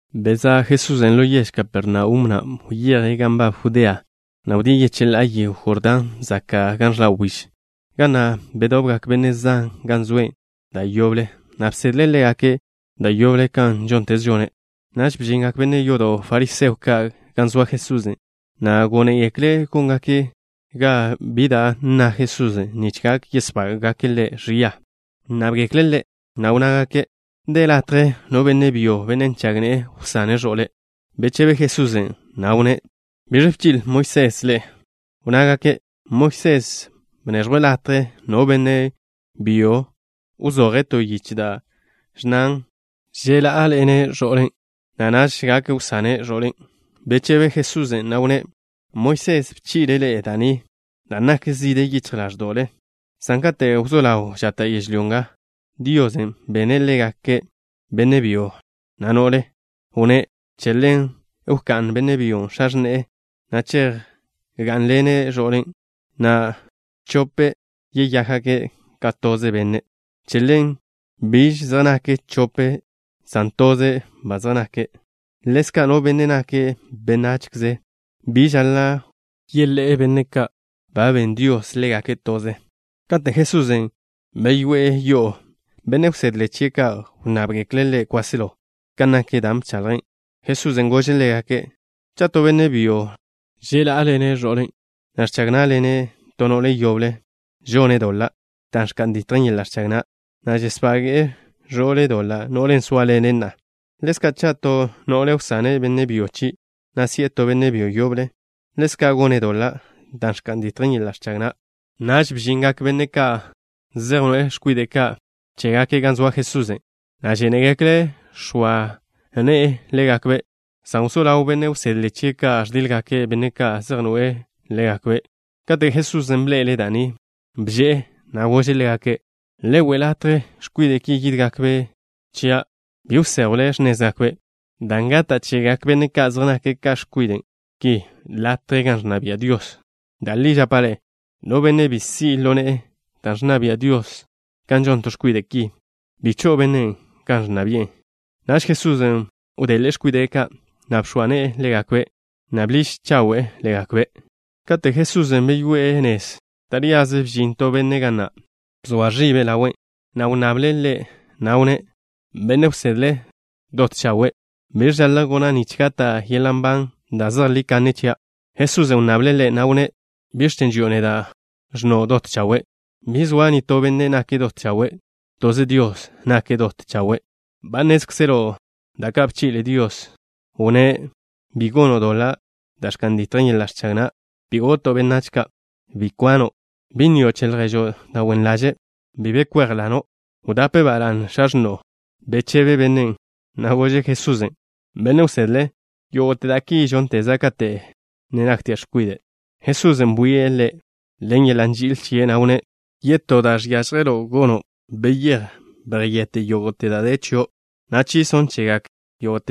Bezá' Jesusen' ḻo yež Kapernaum, na' wyeje' gan nbab Judea, na' wdíe' yecheḻá'a yego Jordán zaka' gan ẕḻa' wbíž, ga na' bedobgak benne' zan gan zoe' da' yoble, na' bsedle' ḻégake' da' yoble kan žónteze žone'. Naž bžingak benne' yodo' fariseo ka' gan zoa Jesusen', na' gónegekle' góngake' ga bi da' nna Jesusen' nich gak yesbága'gake' Ḻe' ẕia. Wnnábgekle' Ḻe', na' wnnágake': —¿De latje no benne' byo, benne' nžag ne'e, wsane' ẕo'le'? Bechebe Jesusen', na' wnné': —¿Biẕ bchi'le Moisés ḻe'e? Wnnágake': —Moisés bneẕjwe' latje no benne' byo wzoje' to yiche da' ẕnnan ẕḻá'aḻene' ẕo'le', na' naž gak wsane' ẕo'ḻen'. Bechebe Jesusen', na' wnné': —Moisés bchi'le' ḻe'e da' ni dan' nak zide yichj ḻáẕdo'le, san kate' wzó ḻaw žata' yežlyó nga, Dios bene' ḻégake' benne' byo, na' no'le. Wnné': “Che ḻen wká'n benne' byo x̱a x̱ne'e, na' chejgá'nḻene' ẕo'le', na' chope' yeyákgake' ka toze benne'.” Che ḻen biž zej nake' chope' san toze' ba zej nake'. Ḻezka', no benne' nake' benachze bi žaḻa' wḻé'e benne' ka' ba ben Dios ḻégake' toze. Kate' Jesusen' beyoé'e yo'o, benne' wsedle chie' ka' wnnábgekle' Ḻe' kwáselo kan nak dan' bchaḻje'. Jesusen' gože' ḻégake': —Cha' to benne' byo ẕḻá'aḻene' ẕo'le', na' ẕchag ná'ḻene' to no'le yoble, žone' doḻa' da' ẕka'n ditjen yeḻa' ẕchag na', na' žesbage'e ẕo'le' doḻa', no'len' zóaḻene' na'a. Ḻezka' cha' to no'le wsane' benne' byo chie', na' si'e to benne' byo yoble, ḻezka' gone' doḻa' da' ẕka'n ditjen yeḻa' ẕchag na'. Naž bžingak benne' ka' zej noe'e x̱kwide' ka' chégake' gan zoa Jesusen', na' žénegekle' x̱oa ne'e ḻégakbe', san wzó ḻawgak benne' wsedle chie' ka' ẕdíḻgake' benne' ka' zej noe'e ḻégakbe'. Kate' Jesusen' bḻe'ele' da' ni, bže'e, na' gože' ḻégake': —Le we' latje x̱kwide' ki yídgakbe' chia'. Bi wséjwle x̱nézgakbe', dan' gata' chegak benne' ka' zej nake' ka x̱kwide' ki latje gan ẕnna bia' Dios. Da' li žapa' ḻe'e: no benne' bi si' ḻo ne'e da' ẕnna bia' Dios kan žon to x̱kwide' ki, bi cho'o bennen' gan ẕnna bi'e. Naž Jesusen' wdeḻe'e x̱kwide' ka', na' bx̱oa ne'e ḻégakbe', na' bḻiž chawe'e ḻégakbe'. Kate' Jesusen' beyoé'e nez, taríaze bžin to benne' ga na'. Bzoa ẕibe' ḻawe', na' wnnable' Ḻe', na' wnné': —Benne' wsedle, dot chawe', ¿biẕ žaḻa' gona' nich gata' yeḻa' nban da' zejlí kanne chia'? Jesusen' wnnable' ḻe', na' wnné': —¿Biẕ chen' ži'o neda', ẕnno': dot chawe'? Bi zoa nitó benne' nake' dot chawe'. Toze Dios nake' dot chawe'. Ba nnézkzelo' da' ka' bchi'le Dios. Wnné': Bi gono' doḻa' da' ẕka'n ditjen yeḻa' ẕchag na'. Bi goto' benách ka'. Bi kwano'. Bi nnio' che lježo' da' wen ḻaže'. Bi be kwéjlano'. Wdape ba la'ne x̱a x̱no'o. Bechebe bennen', na' gože' Jesusen': —Benne' wsedle, yógo'te da' ki žónteza' kate' naktia' x̱kwide'. Jesusen' bwie' ḻe' ḻen yeḻa' nži'il chie', na' wnné': —To da' žiažjen chio'. Wyéj, yjete' yógo'te da' de chio', na' bneẕjw da' yezi'o chegak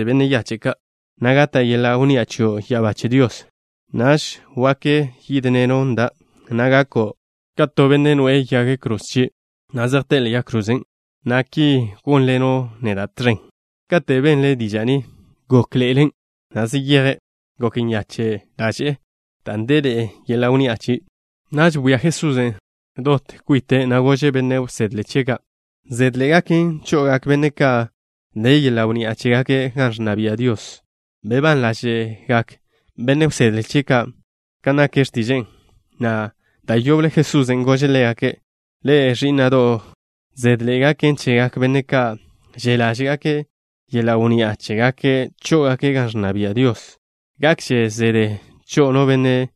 benne' yache' ka', na' gata' yeḻa' wnni'a chio' ya'abá che Dios. Naž wak yežino' chia', na' gako' ka to benne' noe'e yag kroze chie', na' zejté'e ḻe'e yag krozen', na' ki gónḻeno' neda' tẕen. Kate' benle' diža' ni, gokle', na' zeyeje'. Gok nyache' ḻaže'e dan' deḻe'e yeḻa' wnni'a chie'. Naž bwia Jesusen' dot kwite', na' gože' benne' wsedle chie' ka': —Zedḻe'e gaken cho'ogak benne' ka' de yeḻa' wnni'a chégake' gan ẕnna bia' Dios. Bebán ḻáže'gak benne' wsedle chie' ka' kan nak x̱tiže'e, na' da' yoble Jesusen' gože' ḻégake': —Ḻe'e, ẕí'na'do' ka', zedḻe'e gaken chegak benne' ka' že' ḻáže'gake' yeḻa' wnni'a chégake' chó'ogake' gan ẕnna bia' Dios. Gakže zede cho'o no benne'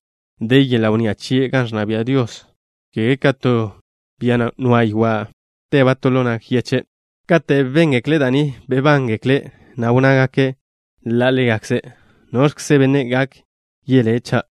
de yeḻa' wnni'a chie' gan ẕnna bia' Dios, ka te to bia nwa'ba' ywa' ḻo nag yeche'. Kate' béngekle' da' ni, bebánḻe'egekle', na' wnnágake' ḻa' ḻégakze': —¿Noẕkze benne' gak yelé', cha'?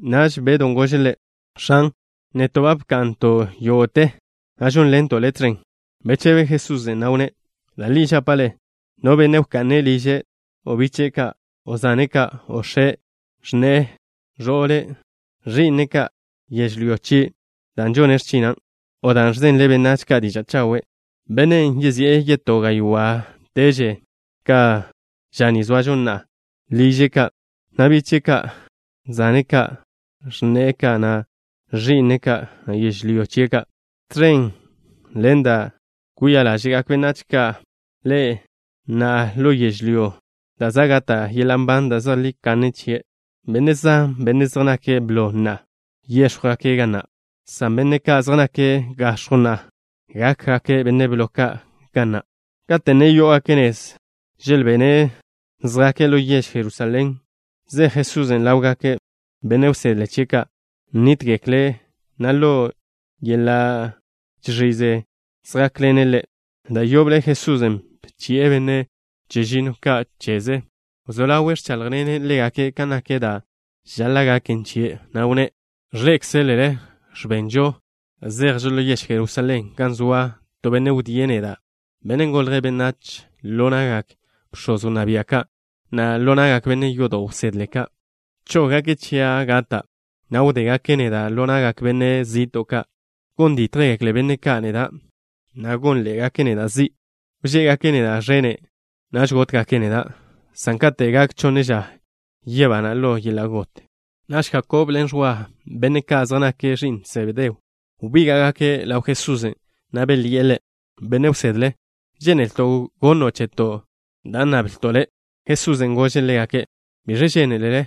Naž Bedw gože' Ḻe': —X̱an, neto' ba bka'nto' yógo'te, na' žónḻento' Le' tẕen. Bechebe Jesusen', na' wnné': —Da' li žapa' ḻe'e, no benne' wka'ne' liže', o biche'e ka', o zane' ka', o x̱e', o x̱ne'e, o ẕo'le', o ẕi'ne' ka', o yežlyó chie', dan' žone' x̱china', o dan' ẕzenle' benách ka' diža' chawe' chian', bennen' yezi'e yetó gaywá'teže ka' ža ni zoažo na'a, liže' ka', na' biche'e ka', na' zane' ka', na' x̱ne'e ka', na' ẕi'ne' ka', na' yežlyó chie' ka', tẕen ḻen da' kwia ḻáže'gak benách ka' ḻe', na' ḻo yežlyó da' za' gata' yeḻa' nban da' zejlí kanne chie'. Benne' zan, benne' zej nake' blo na'a, wéx̱jwgake' ga na', san benne' ka' zej nake' gax̱jw na'a, gákgake' benne' blo ka' ga na'. Kate' ne yó'ogake' nez, želbene' zjake' ḻo yež Jerusalén, zej Jesusen' ḻawgak benne' wsedle chie' ka'. Nítgekle', na' ḻo yeḻa' žẕize zjákḻene' Ḻe'. Da' yoble Jesusen' bchi'e benne' chežinno ka' cheze. Wzó ḻawe' ẕchájḻene' ḻégake' ka nak da' žaḻa' gaken chie', na' wnné': —Ẕḻé'ekzelele ẕbenžo, zejžo ḻo yež Jerusalén gan soa to benne' wdíe' neda', Benne' Golje' Benách, ḻo na'gak bx̱oz wnná bia' ka', na' ḻo na'gak benne' yodo' wsedle ka'. Chóggake' chia' gata', na' wdégake' neda' ḻo na'gak benne' zi'to' ka'. Gon dítjgekle benne' ka' neda', na' gónḻe'egake' neda' zi'. Wžé'egake' neda' ẕene'. Naž gótgake' neda', san kate' gak chonne ža, yebana' ḻo yeḻa' got. Naž Jakob ḻen Ẕwa, benne' ka' zej nake' ẕi'n Sebedeo, wbíga'gake' ḻaw Jesusen', na' belyi'e Ḻe': —Benne' wsedle, žénelto' gono' cheto' da' nnablto' Le'. Jesusen' gože' ḻégake': —¿Biẕ žénelele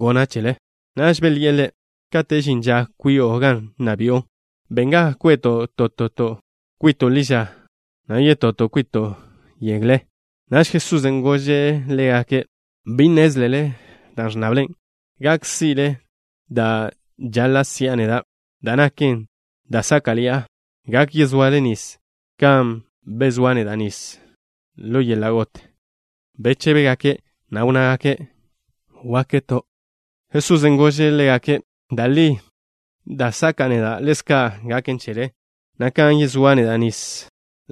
gona' chele? Naž belyi'e Ḻe': —Kate' žin ža kwi'o gan nna bi'o, ben ga kwe'to' toto' kwito' ḻi ža, na' yetoto' kwito' yegle. Naž Jesusen' gože' ḻégake': —Bi nnézlele da' ẕnnable. ¿Gak si'le' da' žaḻa' si'a neda', da' naken da' sáka'ḻi'a? ¿Gak yezoale nis kan yezóa' neda' nis ḻo yeḻa' got? Bechébegake', na' wnnágake': —Gakto'. Jesusen' gože' ḻégake': —Da' li, da' saka'a neda', ḻezka' gaken chele, na' kan yezóa' neda' nis,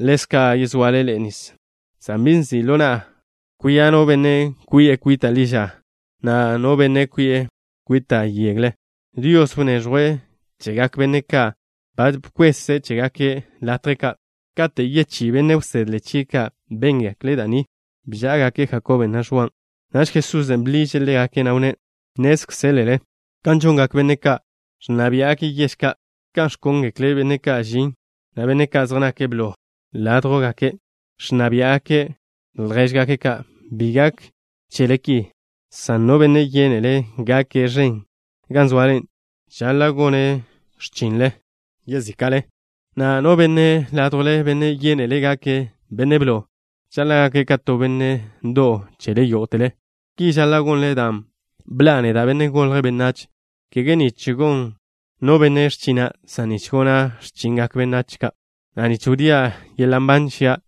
ḻezka' yezoale ḻe'e nis, san bi nzi' ḻo na'a kwia' no benne' kwi'e kwita' ḻi ža, na' no benne' kwi'e kwita' yegle. Dios wneẕjwe' chegak benne' ka' ba bkweze' chégake' latje ka'. Kate' yechí benne' wsedle chie' ka' béngekle' da' ni, bžá'agake' Jakob na', na' Ẕwan'. Naž Jesusen' bḻiže' ḻégake', na' wnné': —Nnézkzelele kan žongak benne' ka' ẕnna biá'gake' yež ka', kan ẕkóngekle' benne' ka' žin, na' benne' ka' zej nake' blo ládjwgake' ẕnna biá'gake' ljéžgake' ka'. Bi gak chele ki, san no benne' yénele' gake' ẕen gan zoale, žaḻa' gone' x̱chinle yezíka'le, na' no benne' ládjwle, benne' yénele' gake' benne' blo, žaḻa' gake' ka to benne' ndo'w chele yógo'tele. Ki žaḻa' gonle dan' bḻa'a neda', Benne' Golje' Benách, kege nich gon no benne' x̱china', san nich gona' x̱chingak benách ka', na' nich wdía' yeḻa' nban chia',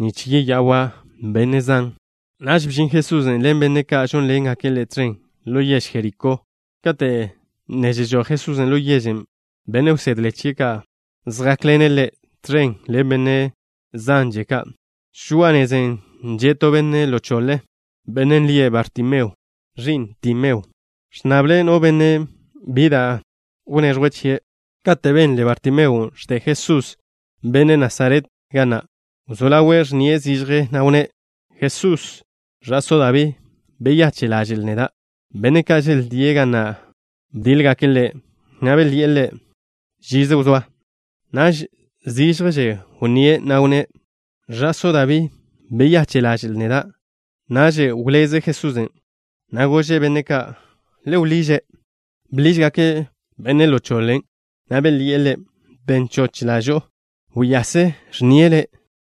nich yeya'wa' benne' zan. Naž bžin Jesusen' ḻen benne' ka' žónḻengake' Ḻe' tẕen ḻo yež Jerikó. Kate' ne žežój Jesusen' ḻo yežen', benne' wsedle chie' ka' zjákḻene' Ḻe', tẕen ḻen benne' zanže ka'. Žoa'a nezen' že' to benne' ḻo choḻe, bennen' lie' Bartimeo, ẕi'n Timeo. Ẕnnable' no benne' bi da' gonnze' chie'. Kate' benle Bartimeon' ẕde Jesús, benne' Nasaret, ga na', wzó ḻawe' ẕnnie' zižje, na' wnné': —Jesús, Ẕa'só Dabí. Beyache' ḻaže'l neda'. Benne' ka' želdíe' ga na' bdíḻgake' ḻe', na' belyi'e ḻe': —Wzóa ži. Naž zižjže wnníe', na' wnné': —Ẕa'só Dabí. Beyache' ḻaže'l neda'. Naž wzé žize Jesusen', ẕbeze', na' gože' benne' ka': —Le wḻiže'. Bḻížgake' benne' ḻo choḻen', na' belyi'e ḻe': —Ben choch ḻažo'o. Wyase. Ẕnnie' le'.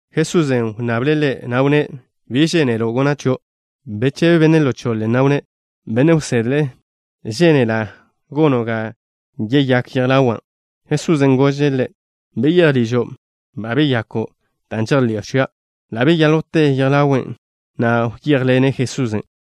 Jesusen' wnnable' ḻe', na' wnné': —¿Biẕ žénelo' gona' chio'? Bechebe benne' ḻo choḻen', na' wnné': —Benne' wsedle, žénela' gono' ga yeyák yej ḻawa'. Jesusen' gože' ḻe': —Beyéj ližo'. Ba beyako' dan' žejḻi'o chia'. Ḻa' beyáljwte yej ḻawe', na' wyéjḻene' Jesusen'.